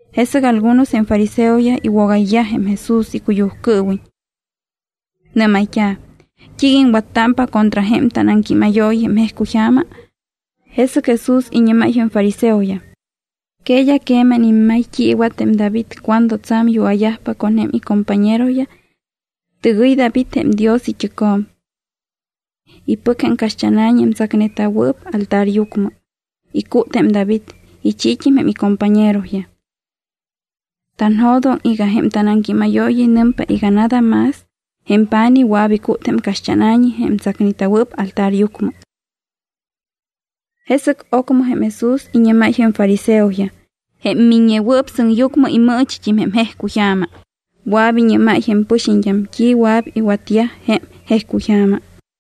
Jesɨc algunos jém fariseoyaj iwogayyaj jém Jesús icuyujcɨɨwiñ. Nɨ́mayt́a̱: —¿T́iiga iŋwattámpa contra jém tanaŋquímayooyi jém jejcuyja̱ma? Jesɨc Jesús iñɨ́máy jém fariseoyaj: —¿Que d́a queman immay t́i iwat jém David cuando tsa̱m yua̱yajpa con jém icompañeroyaj? Tɨgɨy David jém Dios it́ɨcjo̱m. Ipɨc jém caxt́ána̱ñi jém tsacneta̱wɨɨp altaryucmɨ. Icút jém David, ichiit́im jém icompañeroyaj. Tanjo̱doŋ iga jém tanaŋquímayooyi nɨmpa iga nada más jém pa̱nij wɨa̱p icút jém caxt́ána̱ñi jém tsacneta̱wɨɨp altaryucmɨ. Jesɨc ocmɨ jém Jesús iñɨ́máy jém fariseoyaj: —Jém Miññewɨɨp Sɨŋyucmɨ imɨɨchit́im jém jejcuyja̱ma, wɨa̱p iñɨ́máy jém pɨxiñt́am t́i wɨa̱p iwatyaj jém jejcuyja̱ma.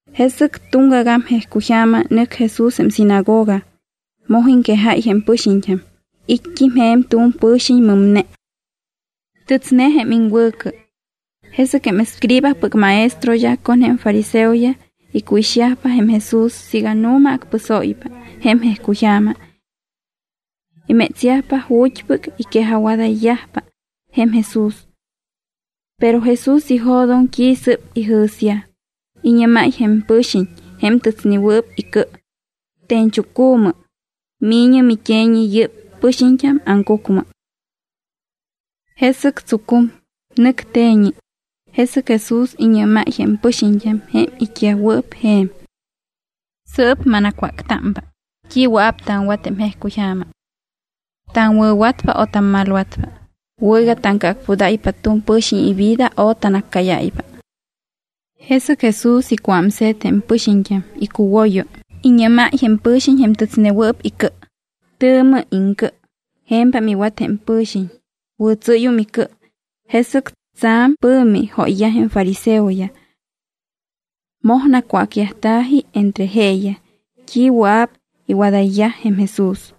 Jesɨc tuŋgagam jejcuyja̱ma nɨc Jesús jém sinagoga. Moj iŋquejáy jém pɨxiñt́am. It́t́im je̱m tu̱m pɨ̱xiñ mɨmne. Tɨtsne jém iŋwɨ̱cɨ. Jesɨc jém escribaspɨc maestroyaj con jém fariseoyaj icuixyajpa jém Jesús siiga nu̱ma acpɨsóypa jém jejcuyja̱ma. Imétsyajpa ju̱t́pɨc iquejajwadayyajpa jém Jesús. Pero Jesús ijo̱doŋ t́i sɨ́p ijɨ̱syaj. Iñɨ́máy jém pɨ̱xiñ jém tɨtsnewɨɨp icɨ: —Te̱ñchucu̱mɨ, mi̱ñɨ mit́e̱ñi yɨ́p pɨxiñt́am aŋcucmɨ. Jesɨc tsucum, nɨc te̱ñi. Jesɨc Jesús iñɨ́máy jém pɨxiñt́am jém it́yajwɨɨp je̱m: —Sɨɨp manacwáctámpa: ¿T́i wɨa̱p taŋwat jém jejcuyja̱ma? ¿Taŋwɨ̱watpa o tammalwatpa? ¿Wɨ̱ iga taŋcɨacpudáypa tu̱m pɨ̱xiñ ivida o tanaccáyáypa? Jesɨc Jesús icuámse̱t jém pɨxiñt́am icuwoyo, iñɨ́máy jém pɨ̱xiñ jém tɨtsnewɨɨp icɨ: —¡Tɨ̱mɨ iŋcɨ! Je̱mpam iwat jém pɨ̱xiñ, wɨ̱tsɨ́yum icɨ. Jesɨc tsa̱m pɨ̱mi jóyyaj jém fariseoyaj. Moj nacwácyajta̱ji entre jeeyaj t́i wɨa̱p iwadayyaj jém Jesús.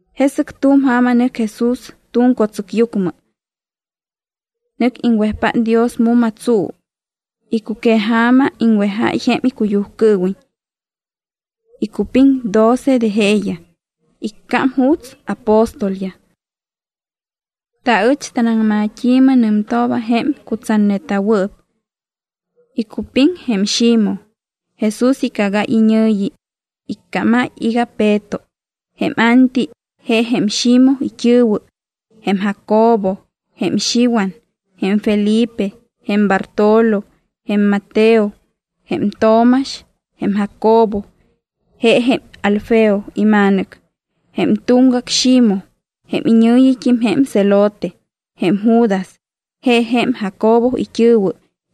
Jesɨc tu̱m ja̱ma nɨc Jesús tu̱m co̱tsɨcyucmɨ. Nɨc iŋwejpát Dios mu̱ma tsuu. Icuqueja̱ma iŋwejáy jém icuyujcɨɨwiñ. Icupiŋ doce de jeeyaj, iccám juuts “apóstolyaj”. Taɨch tanaŋmat́i̱mɨ nɨmtooba jém cutsatneta̱wɨɨp. Icupiŋ jém Ximoj, Jesús icagáy iñɨ̱yi, icámáy iga Peto; jém Anti, je jém Ximoj it́ɨ̱wɨ; jém Jacobo; jém Xiwan; jém Felipe; jém Bartolo; jém Mateo; jém Tomax; jém Jacobo, je jém Alfeo ima̱nɨc; jém tuŋgac Ximoj, jém iñɨ̱yit́im jém Zelote; jém Judas, je jém Jacobo it́ɨ̱wɨ;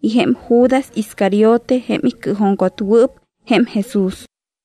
y jém Judas Iscariote jém icɨɨjuŋcotwɨɨp jém Jesús.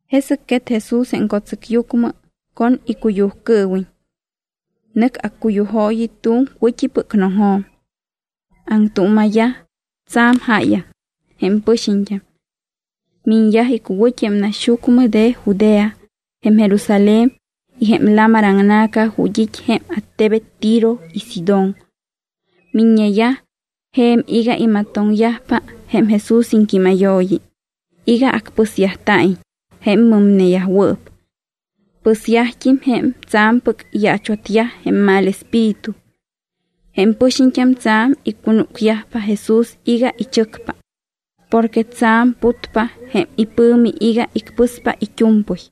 Jesɨc quet Jesús jém co̱tsɨcyucmɨ con icuyujcɨɨwiñ. Nɨc accuyujooyi tu̱m wɨ̱t́ipɨc noŋjo̱m. Aŋtuuma̱yaj tsa̱m jáyaŋ jém pɨxiñt́am. Miñyaj icuwɨ̱t́i jém naxyucmɨ de Judea, jém Jerusalén y jém lamar aŋna̱ca ju̱t́ it́ jém attebet Tiro y Sidón. Miññeyaj je̱m iga imatoŋyajpa jém Jesús iŋquímayooyi, iga acpɨsyajta̱iñ jém mɨmneyajwɨɨp. Pɨsyajt́im jém tsa̱mpɨc iyaachwatyaj jém mal espíritu. Jém pɨxiñt́am tsa̱m icunúcyajpa Jesús iga ichɨcpa porque tsa̱m putpa jém ipɨ̱mi iga icpɨspa it́u̱mpɨy.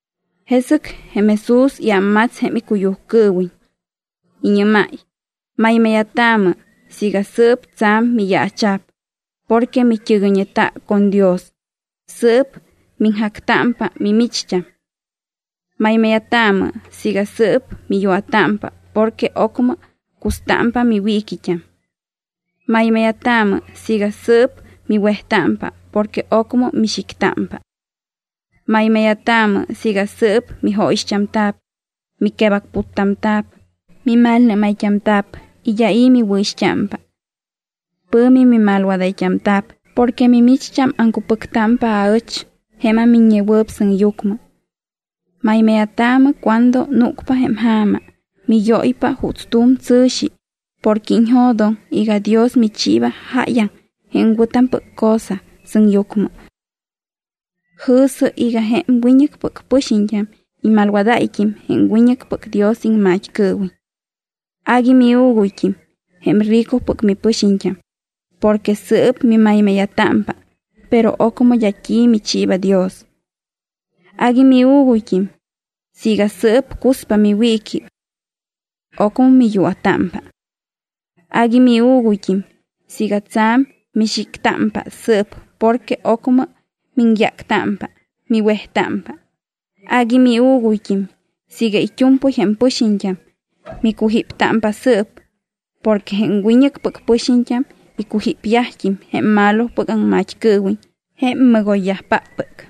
Jesɨc jém Jesús iámmats jém icuyujcɨɨwiñ. Iñɨ́máy: —Maymáya̱taamɨ siiga sɨɨp tsa̱m miyaacha̱p porque mit́ɨgɨyñeta con Dios, sɨɨp miŋjactámpa mimicht́am. ’Maymáya̱taamɨ siiga sɨɨp miyua̱támpa porque ocmɨm custámpa miwiiquit́am. ’Maymáya̱taamɨ siiga sɨɨp miwejtámpa porque ocmɨ mixictámpa. ’Maymáya̱taamɨ siiga sɨɨp mijóyixt́amta̱p, miquebacputtamta̱p, mimalnɨ́mayt́amta̱p y d́a i̱ miwɨ̱ixt́ámpa. Pɨ̱mi mimalwadayt́amta̱p porque mimicht́am aŋcupɨctámpa aɨch jém aMiññewɨɨp Sɨŋyucmɨ. Maymáya̱taamɨ cuando núcpa jém ja̱ma, miyóypa juuts tu̱m tsɨ̱xi, porque iñjo̱doŋ iga Dios michiiba jáyaŋ jém wɨ̱tampɨc cosa sɨŋyucmɨ. Jɨ̱sɨ iga jém wiñɨcpɨc pɨxiñt́am imalwadáyt́im jém wiñɨcpɨc Dios iŋmat́cɨɨwiñ. ’Agui miuuguyt́im jém ricopɨc mipɨxiñt́am porque sɨɨp mimaymáya̱támpa, pero ocmɨ d́a t́i michiiba Dios. ’Agui miuuguyt́im siiga sɨɨp cuspa miwiiqui. Ocmɨ miyua̱támpa. ’Agui miuuguyt́im siiga tsa̱m mixictámpa sɨɨp porque ocmɨ miŋyáctámpa, miwejtámpa. ’Agui miuuguyt́im siiga it́u̱mpɨy jém pɨxiñt́am micujíptámpa sɨɨp, porque jém wiñɨcpɨc pɨxiñt́am icujípyajt́im jém malopɨc aŋmat́cɨɨwiñ jém mɨgoyyajpáppɨc.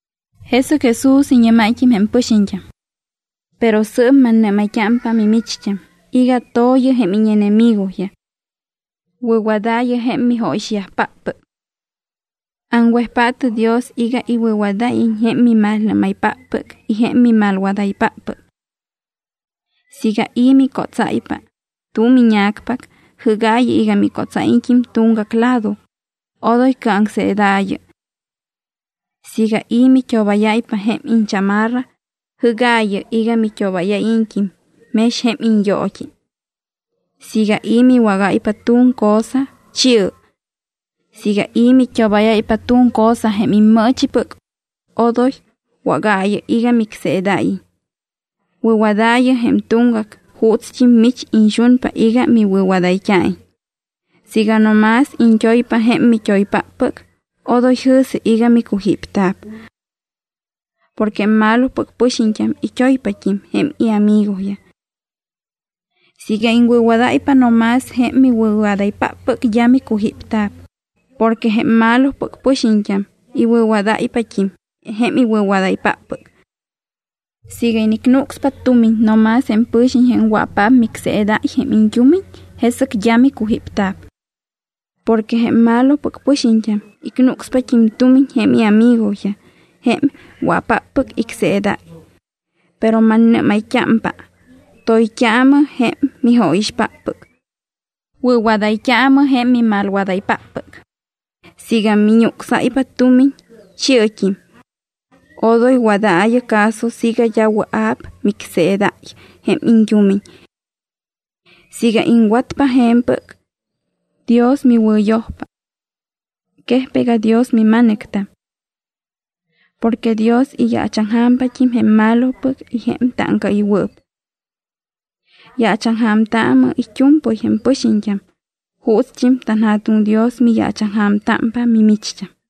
Jesɨc Jesús iñɨ́máyt́im jém pɨxiñt́am: —Pero sɨɨp mannɨ́mayt́ámpa mimicht́am iga to̱yɨ jém íñenemigoyaj. Wɨ̱wadaayɨ jém mijóyixyajpáppɨc. Aŋwejpaatɨ Dios iga iwɨ̱wadáyiñ jém mimalnɨ́maypáppɨc y jém mimalwadaypáppɨc. Siiga i̱ micótsáypa tu̱m íña̱cpac, jɨ́gaayɨ iga micótsáyiñt́im tuŋgac lado, odoy cɨaŋseedaayɨ. Siiga i̱ mit́obáyáypa jém iñchamarra, jɨ́gaayɨ iga mit́obáyáyiñt́im mex jém iñyoot́i. Siiga i̱ miwágáypa tu̱m cosa, chi̱ɨ. Siiga i̱ mit́obáyáypa tu̱m cosa jém immɨɨchipɨc, odom wágaayɨ iga micseedáyiñ. Wɨ̱wadaayɨ jém tuŋgac juutst́im mich iñxunpa iga miwɨ̱wadayt́a̱iñ. ’Siiga no más iñt́oypa jém mit́oypáppɨc, odoy jɨ̱sɨ iga micujípta̱p. Porque jém malopɨc pɨxiñt́am it́oypat́im jém iamigoyaj. Siiga iŋwɨ̱wadáypa no más jém miwɨ̱wadaypáppɨc d́a micujípta̱p porque jém malopɨc pɨxiñt́am iwɨ̱wadáypat́im jém iwɨ̱wadaypáppɨc. Siiga inicnucspa tumiñ no más jém pɨ̱xiñ jém wɨa̱paap micseedáy jém iñt́umiñ, jesɨc d́a micujípta̱p. Porque jém malopɨc pɨxiñt́am icnucspat́im tumiñ jém iamigoyaj jém wɨa̱paap icseedayyaj. Pero mannɨ́mayt́ámpa: Toyt́aamɨ jém mijóyixpáppɨc. Wɨ̱wadayt́aamɨ jém mimalwadaypáppɨc. Siiga miñucsáypa tumiñ, chi̱ɨt́im. Odoy wadaayɨ caso siiga d́a wɨa̱p micseedáy jém iñt́umiñ. Siiga iŋwatpa je̱mpɨc, Dios miwɨ̱yojpa. Quejpa iga Dios mima̱nɨctam. Porque Dios iyaachaŋja̱mpat́im jém malopɨc y jém táŋcaɨywɨɨp. Yaachaŋja̱mtaamɨ it́u̱mpɨy jém pɨxiñt́am juutst́im tanJa̱tuŋ Dios miyaachaŋja̱mtámpa mimicht́am.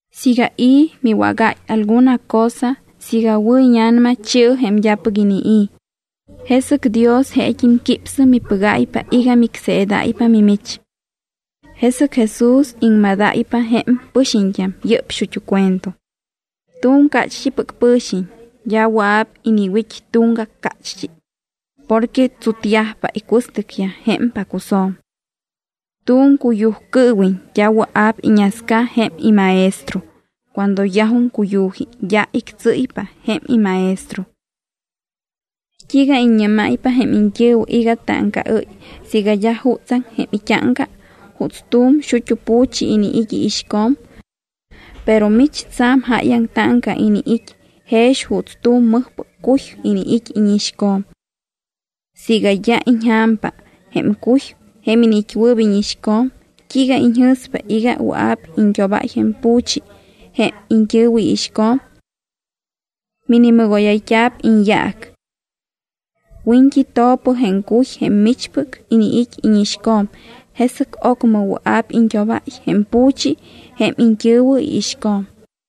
Siiga i̱ miwágáy alguna cosa, siiga wɨ̱ íña̱nama, chi̱ɨ jém d́apɨc inii̱, jesɨc Dios jeet́im quípsɨ mipɨgáypa iga micseedáypa mimich. Jesɨc Jesús iŋmadáypa jém pɨxiñt́am yɨ́p xut́u cuento: —Tu̱m cácht́ipɨc pɨ̱xiñ d́a wɨa̱p iniwit́ tuŋgac cácht́i porque tsutyajpa icuɨstɨcyaj jém pacusjo̱m. Tu̱m cuyujcɨɨwiñ d́a wɨa̱p iñasca jém imaestro, cuando yajum cuyu̱ji d́a ictsɨ́ypa jém imaestro. ’T́iiga iññɨ́máypa jém iñt́ɨ̱wɨ iga táŋcaɨ́y siiga d́a jutsaŋ jém it́áŋca juuts tu̱m xut́u pu̱chi iniit́ iixco̱m. Pero mich tsa̱m jáyaŋ táŋca iniit́ jex juuts tu̱m mɨjpɨc cuy iniit́ íñixco̱m. Siiga d́a iñja̱mpa jém cuy jém iniit́wɨɨp íñixco̱m, t́iiga iñjɨ̱spa iga wɨa̱p iñt́obáy jém pu̱chi jém iñt́ɨ̱wɨ iixco̱m. Minimɨgóyayt́a̱p iñyaac. Wiñt́i to̱pɨ jém cuy jém michpɨc iniit́ íñixco̱m, jesɨc ocmɨ wɨa̱p iñt́obáy jém pu̱chi jém iñt́ɨ̱wɨ iixco̱m.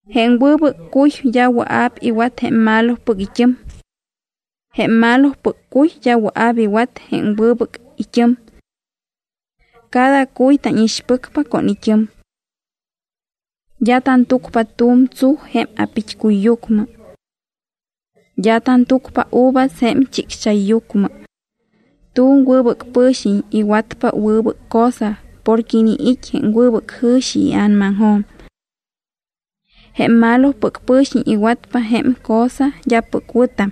’Jém wɨbɨc cuy d́a wɨa̱p iwat jém malopɨc it́ɨm. Jém malopɨc cuy d́a wɨa̱p iwat jém wɨbɨc it́ɨm. Cada cuy tánixpɨcpa con it́ɨm. D́a tantúcpa tu̱m tsuj jém a̱pit́cuyyucmɨ. D́a tantúcpa uvas jém chicxchayyucmɨ. Tu̱m wɨbɨc pɨ̱xiñ iwatpa wɨbɨc cosa porque iniit́ jém wɨbɨc jɨ̱xi ia̱namaŋjo̱m. Jém malopɨc pɨ̱xiñ iwatpa jém cosa d́apɨc wɨ̱tam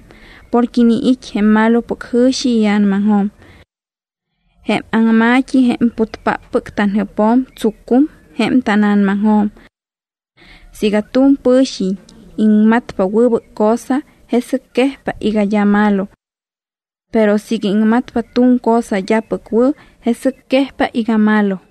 porque iniit́ jém malopɨc jɨ̱xi ia̱namaŋjo̱m. Jém aŋma̱t́i jém putpáppɨc tanjɨpjo̱m tsucum jém tána̱namaŋjo̱m. Siiga tu̱m pɨ̱xiñ iŋmatpa wɨbɨc cosa, jesɨc quejpa iga d́a malo. Pero siiga iŋmatpa tu̱m cosa d́apɨc wɨ̱, jesɨc quejpa iga malo.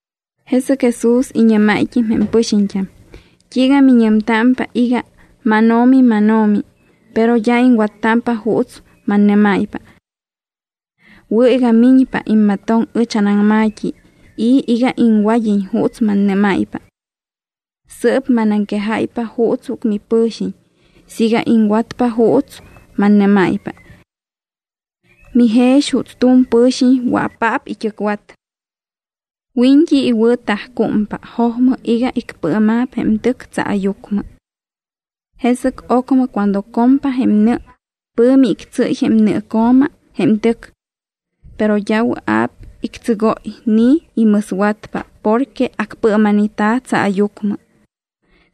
Jesɨc Jesús iñɨ́máyt́im jém pɨxiñt́am: —¿T́iiga miñɨmtámpa iga, “MánO̱mi, mánO̱mi”, pero d́a iŋwattámpa juuts mannɨ́máypa? Wɨ̱ iga miñpa immatoŋ ɨch anaŋma̱t́i y iga iŋwad́iñ juuts mannɨ́máypa. Sɨɨp manaŋquejáypa juutspɨc mipɨ̱xiñ siiga iŋwatpa juuts mannɨ́máypa. Mijex juuts tu̱m pɨ̱xiñ wɨa̱paap it́ɨcwat. Wiñt́i iwɨ̱tajcúmpa jojmɨ iga icpɨɨma̱p jém tɨc tsaayucmɨ. Jesɨc ocmɨ cuando compa jém nɨ, pɨ̱mi ictsɨ́y jém nɨɨco̱ma jém tɨc. Pero d́a wɨa̱p ictsɨgóy ni imɨswatpa porque acpɨɨma̱neta̱ tsaayucmɨ.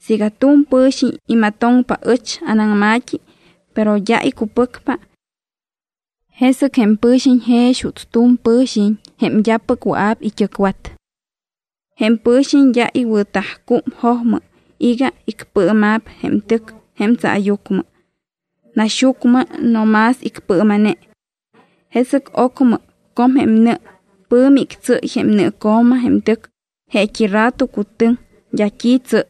Siiga tu̱m pɨ̱xiñ imatoŋpa ɨch anaŋma̱t́i, pero d́a icupɨcpa, jesɨc jém pɨxiñ jex juuts tu̱m pɨ̱xiñ jém d́apɨc wɨa̱p it́ɨcwat. Jém pɨ̱xiñ d́a iwɨ̱tajcúm jojmɨ iga icpɨɨma̱p jém tɨc jém tsaayucmɨ. Naxyucmɨ no más icpɨɨma̱ne. Jesɨc ocmɨ com jém nɨ, pɨ̱mi ictsɨ́y jém nɨɨco̱ma jém tɨc, jeet́i rato cutɨŋ, d́a t́i tsɨ́y.